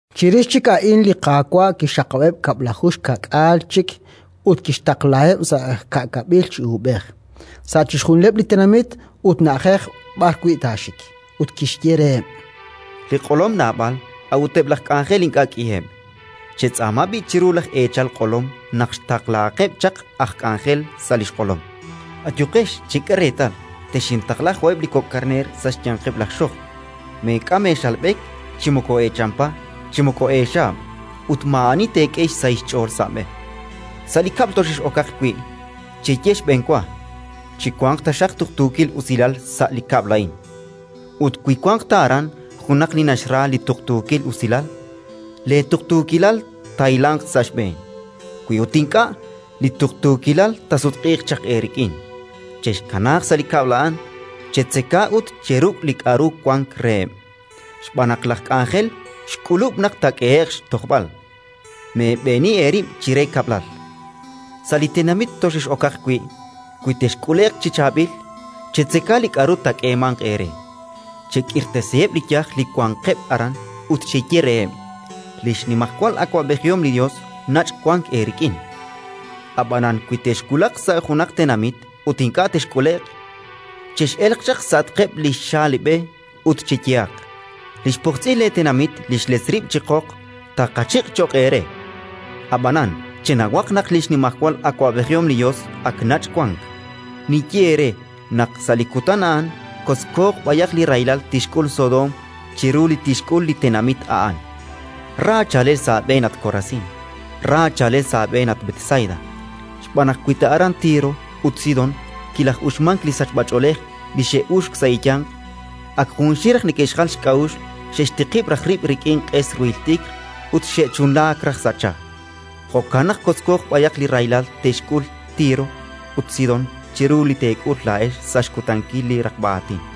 Chirix chik a'in li Qaawa' kixxaqab'eb' kab'laju xkaak'aal chik ut kixtaqlaheb' sa' ka'kab'il chi uub'ej, sa' chixjunileb' li tenamit ut na'ajej b'arwi' taaxik. Ut kixye reheb': “Li q'olom naab'al, a'ut eb' laj k'anjel ink'a' k'iheb'. Chetz'aama b'i' chiru laj Eechal q'olom naq xtaqlahaqeb' chaq aj k'anjel sa' li xq'olom. “Ayuqex. Chek'e reetal, texintaqla jo'eb' li kok' karneer sa' xyanqeb' laj xojb'. Meek'am eexalb'ek, chi moko eechampa, chi moko eexaab'; ut maa'ani teek'e xsahil xch'ool sa' b'e. Sa' li kab'l toxex'okaq wi', cheye xb'enwa: «Chiwanq taxaq tuqtuukil usilal sa' li kab'l a'in». Ut wi wanq ta aran junaq li naxra li tuqtuukil usilal, leetuqtuukilal taahilanq sa' xb'een; wi ut ink'a', li tuqtuukilal taasutq'iiq chaq eerik'in. Chexkanaaq sa' li kab'l a'an, chetzeka ut cheruk' li k'aru wank reheb', xb'aan naq laj k'anjel xk'ulub' naq taak'ehe'q xtojb'al. Meeb'eeni eerib' chire kab'lal. “Sa' li tenamit toxex'okaq wi', wi texk'ule'q chi chaab'il, chetzeka li k'aru taak'eemanq eere. Chek'irtasiheb' li yaj li wanqeb' aran ut cheye reheb': «Li xnimajwal awab'ejihom li Yos nach' wank eerik'in». “Ab'anan wi texwulaq sa' junaq tenamit ut ink'a' texk'ule'q, chex'elq chaq sa'atqeb' li xaalib'e ut cheyehaq: «Li xpojtz'il leetenamit li xletz rib' chi qoq taaqachiq' cho'q eere. Ab'anan, chenawaq naq li xnimajwal awab'ejihom li Yos ak nach' wank». Ninye eere naq sa' li kutan a'an kotzkooq b'ayaq li rahilal tixk'ul Sodoom chiru li tixk'ul li tenamit a'an. “Ra chaalel sa' aab'een, at Korasín! Ra chaalel sa' aab'een, at Betsaida! Xb'aan naq wi ta aran Tiro ut Sidón kilaj'uxmank li sachb'ach'oolej li xe'uxk sa' eeyanq, ak junxil raj neke'xjal xk'a'uxl, xe'xtiqib' raj rib' rik'in q'es ruhil t'ikr ut xe'chunlaak raj sa' cha. Jo'kan naq kotzko b'ayaq li rahilal te'xk'ul Tiro ut Sidón chiru li teek'ul laa'ex sa' xkutankil li raqb'a aatin.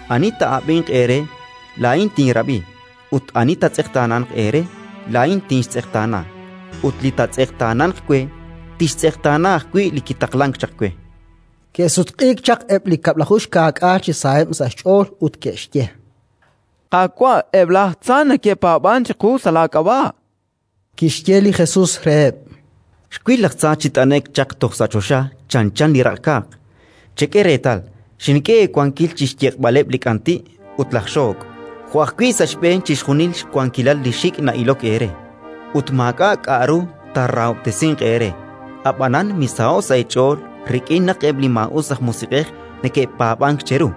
“Ani taa'ab'inq eere, laa'in tinrab'i; ut ani taatz'eqtaananq eere, laa'in tinxtz'eqtaana; ut li taatz'eqtaananq we, tixtz'eqtaana ajwi' li kitaqlank chaq we”. Ke'sutq'iik chaq eb' li kab'laju xkaak'aal chi saheb' sa' xch'ool ut ke'xye: —Qaawa', eb' laj tza neke'paab'ank chiqu sa' laak'ab'a'! Kixye li Jesus reheb': —Xwil laj tza chi t'ane'k chaq toj sa' choxa chanchan li raq'kaaq. Chek'e reetal, xink'e eewankil chi xyeq'b'aleb' li k'anti' ut laj xook', jo' ajwi' sa' xb'een chixjunil xwankilal li xik' na'ilok eere; ut maak'a' k'aru taarahob'tesinq eere. Ab'anan misaho'k sa' eech'ool rik'in naq eb' li maa'us aj musiq'ej neke'paab'ank cheru;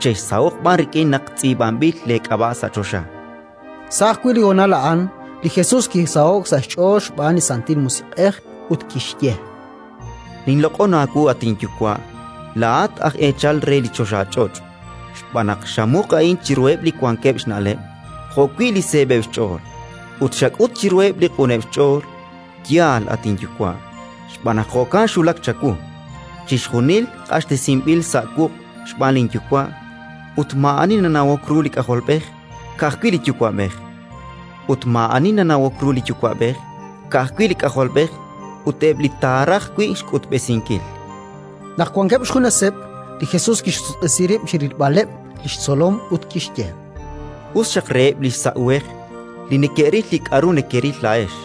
chexsaho'q b'an rik'in naq tz'iib'anb'il leek'ab'a' sa' choxa. Sa' ajwi' li honal a'an, li Jesus kisaho'k sa' xch'ool xb'aan li Santil Musiq'ej ut kixye: “Ninloq'on aawu, at inYuwa', laa'at aj eechal re li choxach'och', xb'aan naq xamuq a'in chiruheb' li wankeb' xna'leb' jo'wi' li seeb'eb' xch'ool, ut xak'ut chiruheb' li q'uneb' xch'ool. Yaal, at inYuwa', xb'aan naq jo'kan xwulak chawu. “Chixjunil q'axtesinb'il sa' wuq' xb'aan linYuwa', ut maa'ani nanawok ru li K'ajolb'ej, ka'ajwi' li Yuwa'b'ej; ut maa'ani nanawok ru li Yuwa'b'ej, ka'ajwi' li K'ajolb'ej ut eb' li taaraj wi' xk'utb'esinkil”. Naq wankeb' xjuneseb', li Jesus kixsutq'isi rib' chi rilb'aleb' li xtzolom ut kixye: “Us xaq reheb' li xsa' uhej li neke'ril li k'aru nekeril laa'ex.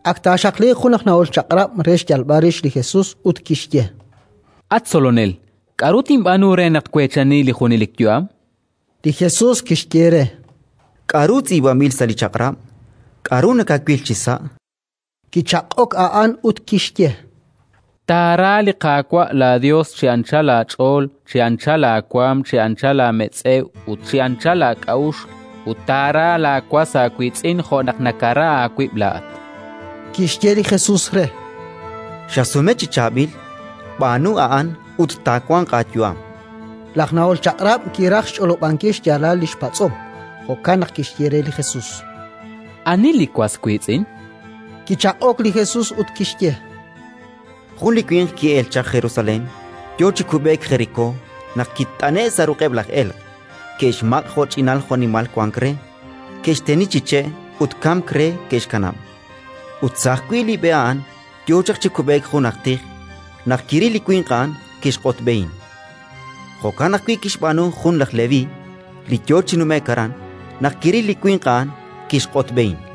Ak taaxaqliiq jun aj nahol Chaq'rab' re xyalb'al rix li Jesus, ut kixye: —At Tzolonel, k'aru tinb'aanu re naq tweechani li junelik yu'am? Li Jesus kixye re: —K'aru tz'iib'anb'il sa' li Chaq'rab'? K'aru nakawil chisa'? Kichaq'ok a'an ut kixye: —Taara li Qaawa' laaYos chi anchal aach'ool, chi anchal aawaanm, chi anchal aametz'ew ut chi anchal aak'a'uxl; ut taara laawas aawiitz'in jo' naq nakara aawib' laa'at. Kixye li Jesus re: —Xasume chi chaab'il. B'aanu a'an ut taawanq aayu'am. Laj nahol Chaq'rab' kiraj xch'olob'ankil xyaalal li xpatz'om, jo'kan naq kixye re li Jesus: —Ani li was wiitz'in? Kichaq'ok li Jesus ut kixye: —Jun li winq ki'elk chaq Jerusalén. Yo chi kub'eek Jerikó naq kit'ane'k sa' ruq'eb' laj elq': ke'xmaq' jo'ch'inal jo'nimal wank re, ke'xteni chi che' ut kamk re ke'xkanab'. Ut sa' ajwi' li b'e a'an yo chaq chi kub'eek jun aj tij; naq kiril li winq a'an, kixq'otb'ehin. Jo'kan ajwi' kixb'aanu jun aj Leví li yo chi nume'k aran: naq kiril li winq a'an, kixq'otb'ehin.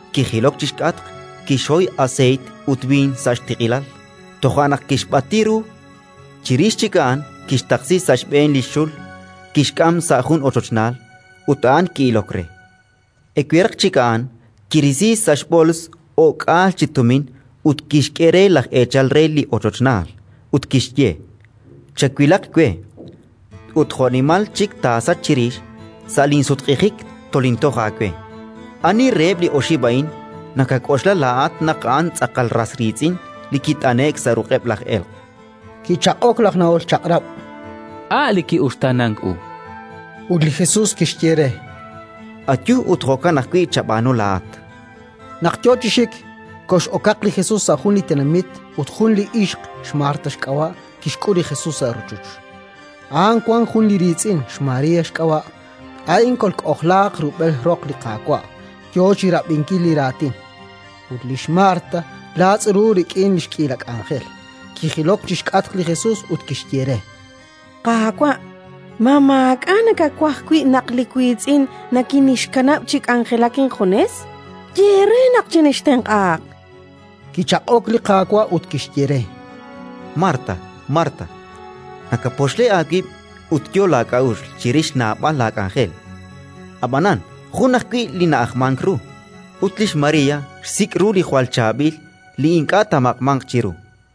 Kijilok chi xk'atq, kixhoy aseeyt ut b'iin sa' li xtiq'ilal, toja' naq kixb'ati ru. Chirix chik a'an kixtaqsi sa' xb'een li xxul, kixk'am sa' jun ochochnaal, ut a'an ki'ilok re. Eweraq chik a'an, kirisi sa' xb'ools o'k'aal chi tumin ut kixk'e re laj eechal re li ochochnaal, ut kixye: «Chawilaq we, ut jo'nimal chik taasach chirix, sa' linsutq'ijik tolintoj aawe». “Ani reheb' li oxib' a'in nakak'oxla laa'at naq a'an tz'aqal ras riitz'in li kit'ane'k sa' ruq'eb' laj elq'?”. Kichaq'ok laj nahol Chaq'rab': —A' li ki'uxtaanank u. Ut li Jesus kixye re: —Ayu ut jo'kan ajwi' chab'aanu laa'at. Naq yo chi xik, kox'okaq li Jesus sa' jun li tenamit; ut jun li ixq, xMarta xk'ab'a', kixk'ul li Jesus sa' rochoch. A'an wank jun li riitz'in, xMaría xk'ab'a'; a'in kolk'ojlaaq rub'el roq li Qaawa', yo chi rab'inkil li raatin. Ut lix Marta laatz' ru rik'in li xk'iila k'anjel. Kijilok chi xk'atq li Jesus ut kixye re: —Qaawa', ma maak'a' nakawaj wi' naq li wiitz'in nikinxkanab' chi k'anjelak injunes? Ye re, naq chinxtenq'ahaq. Kichaq'ok li Qaawa' ut kixye re: —Marta, Marta, nakapoxle aawib' ut yo laak'a'uxl chirix naab'al laak'anjel; ab'anan jun ajwi' li na'ajmank ru, ut lix María xsik' ru li jwal chaab'il li ink'a' taamaq'manq chiru.